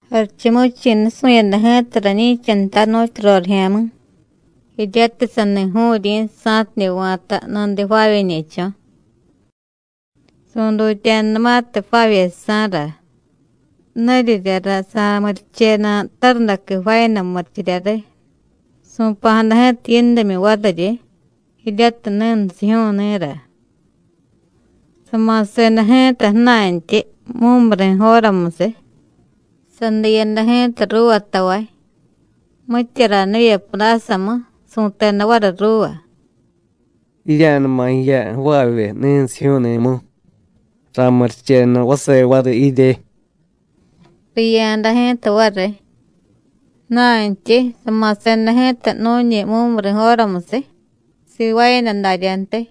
“Jarichumuvichi̱ nusu̱yada ji̱ta rañi̱cha nta nu̱tyu rorijya̱mi̱, jiryatiy sani ju̱u̱ryi̱ sa̱tidye va̱ta nudiy jvaavyeñe̱cho̱. Su̱dutya̱danumatiy jvaavyejsa̱ra nuriryara sa̱murichenu tarundaqui jvaayada murichirya riy, su̱pa̱jada ji̱ta yindimyu variryi, jiryatiy ni̱nsijyu̱u̱ni̱ra. Sama̱seda ji̱ta ju̱na̱ntyi mumuri̱ jóramusiy, sadiyada ji̱ta ruuva tavay, mitya ranivye pudásamu, su̱teda variy ruuva: ‘Jirya̱numa jiya jvaavye ni̱nsijyu̱u̱ni̱mu, ra̱murichenu vase variy jirye.’ Riya̱da ji̱ta variy. Ju̱na̱ntyi sama̱seda ji̱ta nu̱ñi mumuri̱ jóramusiy, sivaayada daryadantyi.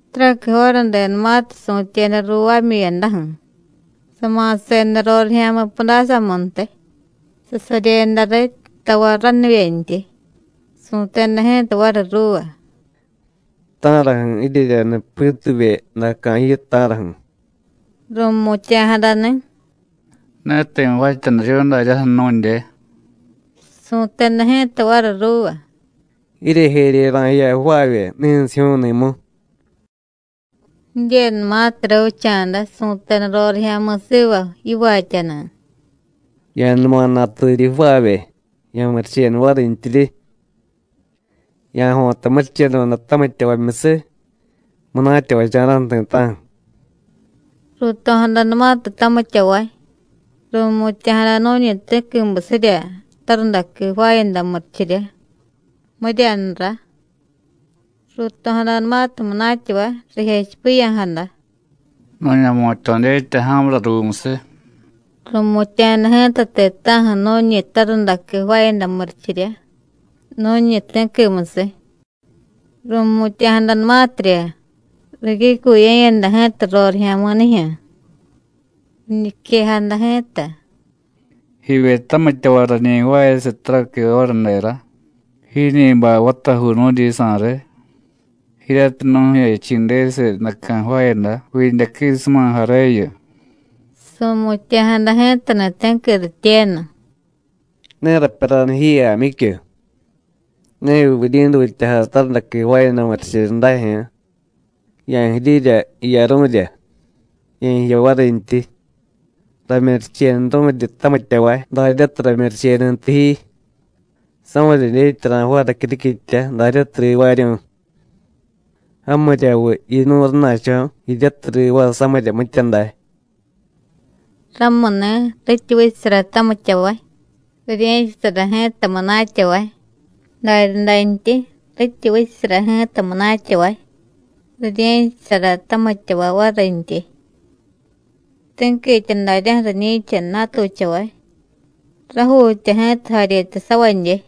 Taraqui jóradenumatiy su̱tyeda ruuvaamyu̱yadaju̱, sama̱seda rorijya̱mi̱ pudásamuntiy, sasaryeda riy tavay ranivyentyi, su̱teda ji̱ta variy ruuva: ‘¿Ta̱raju̱ jiryeryaniy pituvye ju̱daca̱ jiyu, ta̱raju̱?’ Ru̱mutya̱jadani̱: ‘Ne ti̱ jvaatyaniryu̱y daryaju̱ nu̱dye.’ Su̱teda ji̱ta variy ruuva: ‘Jiryejerye ra̱jiya jvaavye ni̱nsijyu̱u̱ni̱mu.’ Jidyenumatiy ravicha̱da, su̱teda rorijya̱mi̱ siva yivaatyani̱: ‘Ya̱numa naturyi jvaavye, ya̱murichenu varintyiryi. Ya̱jo̱ta murichedoda tamityavamyusiy, munatyavacha̱ra̱ju̱ ti̱ta̱ju̱.’ Ruuto̱jadanumatiy tamityavay, ru̱mutya̱jada nu̱ñi ti̱quimusirya tarundaqui jvaayada murichirya, miryanura. Ru̱to̱jadanumatiy munatyavay, rijechipiya̱jada: ‘Nu̱ña̱jmutya̱ dyetya ja̱mura ruumusiy.’ Ru̱mutya̱jada ji̱ta ti̱ta̱ju̱ nu̱ñi tarundaqui jvaayada murichirya nu̱ñi ti̱quimusiy. Ru̱mutya̱jadanumatirya, ricyucuye̱yada ji̱ta rorijya̱mi̱nijyu̱. Riñiquejada ji̱ta: ‘Jivye tamityavay, rañi jvaayasiy taraqui jóradera, jiiñi bay vatajuu nu̱dyisa̱ riy, jiryatiy nu̱jechi̱desiy ju̱daca̱ jvaayada vidyaquisumajareyu.’ Su̱mutya̱jada ji̱tani̱ ti̱qui rityenu: ‘Ne rapyaranu ji, Jaamyicyu. ¿Neviy vuryi̱dutyajay tarundaqui jvaayada murichirya dajyu̱ú̱? Ya̱jirirya jiyaru̱rya, ye̱jiya varintyi. Ramyurichenuru̱ryi tamityavay daryatiy ramyurichenuntiy ji. ¿Samirya dyetya ra̱jvaay racyuriquitya daryatiy rivaaryu̱y? ¿Jamiryamuviy yinu̱y rana̱cho̱ jiryatiy rivaay samirya mitya day?’ Ramuni̱, rityi vichasara tamityavay, rirye̱chasara ji̱ta munatyavay, daryadantyi, rityi vichasara ji̱ta munatyavay, rirye̱chasara tamityavay varintyi. Ti̱quitya daryaju̱ riñi̱cha natuchavay, rajuutya ji̱ta jaryetasavadye.”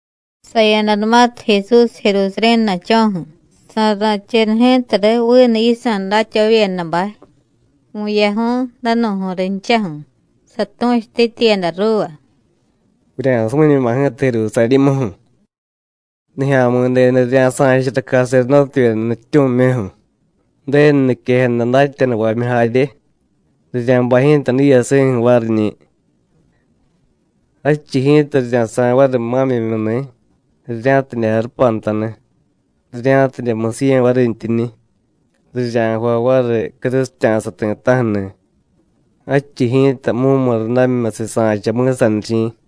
Saya̱danumatiy Jesús Jerusarí̱ na̱cho̱ju̱, sa̱ra̱cheda ji̱ta riy vinu yisa̱ datyavavyedabay vu̱yaju̱y, danu̱ju̱y rinchaju̱, satu̱chutityiyada ruuva: “Vurya̱sumiñuma ji̱ta Jerusarí̱muju̱. Nijya̱mi̱denu rirya̱sa̱chara caserdótevyeda nutyityu̱mimyuju̱, Ju̱denu niquejada datyanuvamyu jarye, rirya̱bay ji̱ta diiyasi̱ju̱ variñi̱. Jadchiy ji̱ta rirya̱sa̱y variy ma̱myimyuni̱, rirya̱tidye jarupantani̱, rirya̱tidye musiye̱ varintyiñi̱, rirya̱jvay variy crusitya̱sa ti̱ta̱ju̱ni̱; jadchiy ji̱ta mumurundamimyusiy sa̱cha mi̱sanichi̱.”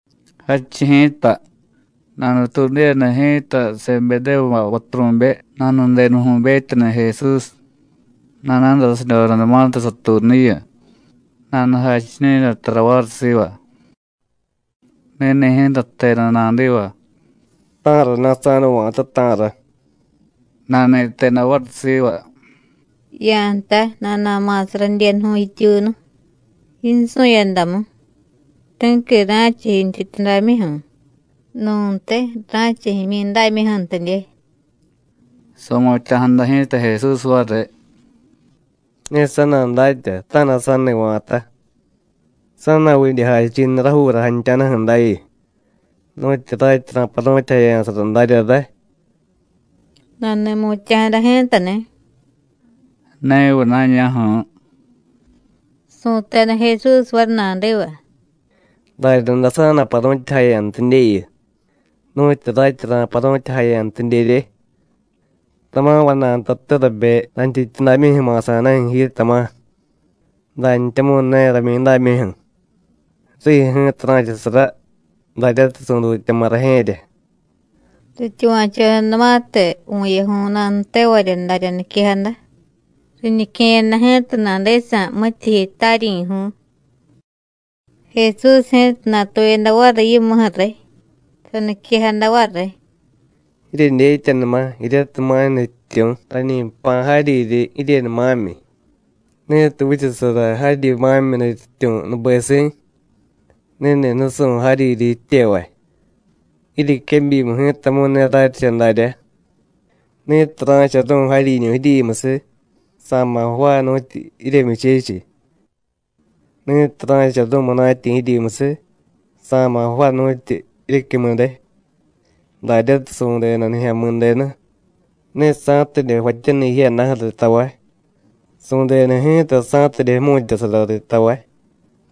Jadchiy ji̱ta, nanutuudiyada ji̱ta Sebedévubay vaturu̱be nanudenuju̱betyani̱ Jesús, nana̱dasidyodanumatiy satuunuyu, nanujachiñu̱yada tara variy siva. Ni̱ni̱ ji̱ta jteda nadiva: “¿Ta̱rana̱ sa̱nuva̱ta, ta̱ra?” Nani̱teda variy siva: “Ya̱jtay nana̱ma̱sa radyenuju̱y jityuunu, yinsu̱yadamu, ti̱qui ra̱cha yintyityudamyuju̱, nu̱ntiy ra̱cha jimyidámyuju̱ntidye.” Su̱mutya̱jada ji̱ta Jesús variy: “Ne sa̱dadatya ta̱na̱ sa̱ni va̱ta. ¿Sa̱na̱vidye jachi̱niy rajuura jantya̱daju̱ dayu, nu̱tyi ratyi ra̱paru̱tyajaya̱sara darya ray?” Nani̱mutya̱jada ji̱tani̱: “¡Neviy na̱ña̱ju̱ú̱!” Su̱teda Jesús variy nadiva: “Daryaday sa̱na̱paru̱tyajaya̱ntidyeyu, nu̱tyu ratyi ra̱paru̱tyajaya̱ntidyerye. Tama̱ vana̱y ntate rabe rayntyityudamyuju̱ ma̱sa̱daju̱ ji, tama̱, dantyamu̱y ne ramyidámyuju̱. Rijyu̱ ji̱ta ra̱chasara daryatiy su̱dutyama̱ Rajye̱rya.” Rityuva̱chodanumatiy vu̱yaju̱y nanutevarya darya niquejada, riñique̱yada ji̱ta nadisa̱ mityijyi taryi̱ju̱y. Jesús ji̱ta natuyada variy yimuju̱ riy, saniquejada variy: “Jiryedyetyanuma jiryatiy ma̱y nutyityu̱ rañi jpa̱ jaryiryi jiryenu ma̱myi. Ni̱tiy vichasara jaryi ma̱myi nutyityu̱ nubesi̱, ni̱ni̱ nusu̱y jaryiryi jityevay. Jiryequebyimu ji̱tamu̱y ne raryicha daryá. Ni̱tiy ra̱charu̱y jaryiñu̱ jiryimusiy, sa̱ma̱ jvaay nu̱tyu jiryemyuchechiy. Ni̱tiy ra̱charu̱y munatyi̱ jiryimusiy, sa̱ma̱ jvaay nu̱tyu jiryecyumude, daryatiy su̱deda Nijya̱mi̱denu, ne sa̱tidye jvaatyaniy jiyadaju̱ riy tavay, su̱deda ji̱ta sa̱tidye jmu̱tyasara riy tavay,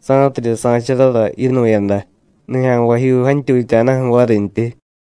sa̱tidye sa̱charara yinu̱yada nijya̱nvajyuu jantyutya̱daju̱ varintyi.”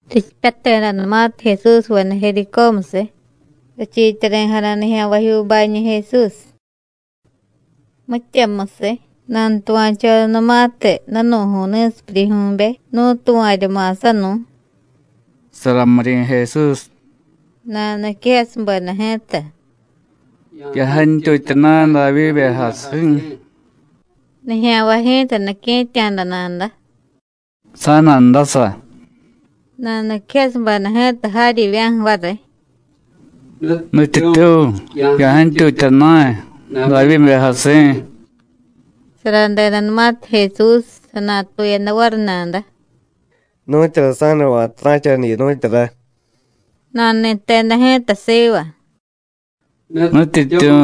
Richipyatedanumatiy Jesúsveda Jericómusiy, richiityari̱jada nijya̱nvajyuubañi̱ Jesús. Mityamusiy, nanutuva̱chodanumatiy danu̱ju̱y ni̱sipyuryijyu̱be nú̱tuva̱rya ma̱sanu̱y: “Saramiryi̱ Jesús,” nanuniquejasubeda ji̱ta: “¡Ya̱jantyutya na̱y, Davyíbe jasi̱!” Nijya̱nvay ji̱ta nique̱tya̱da nada: “¡Sa̱na̱ndasa!” Nanuniquejasubeda ji̱ta jaryivya̱ju̱ variy: “¡Nutyityu̱, ya̱jantyutya na̱y, Davyíbe jasi̱!” Saradedanumatiy Jesús, sanatuyada variy nada: “¿Nu̱tyura sa̱dava̱ta ra̱chaniyu, nu̱tyura?” Nani̱teda ji̱ta siva: “¡Nutyityu̱,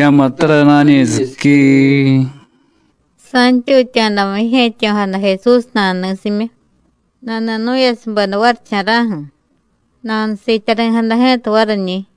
ya̱muttara na̱ñi̱siquiii!” Sa̱ntyutya̱damu jije̱tyo̱jada Jesús nanuni̱simyu, nani̱nu̱yasubeda varicha̱ra̱ju̱, nanusiityari̱jada ji̱ta variñi̱.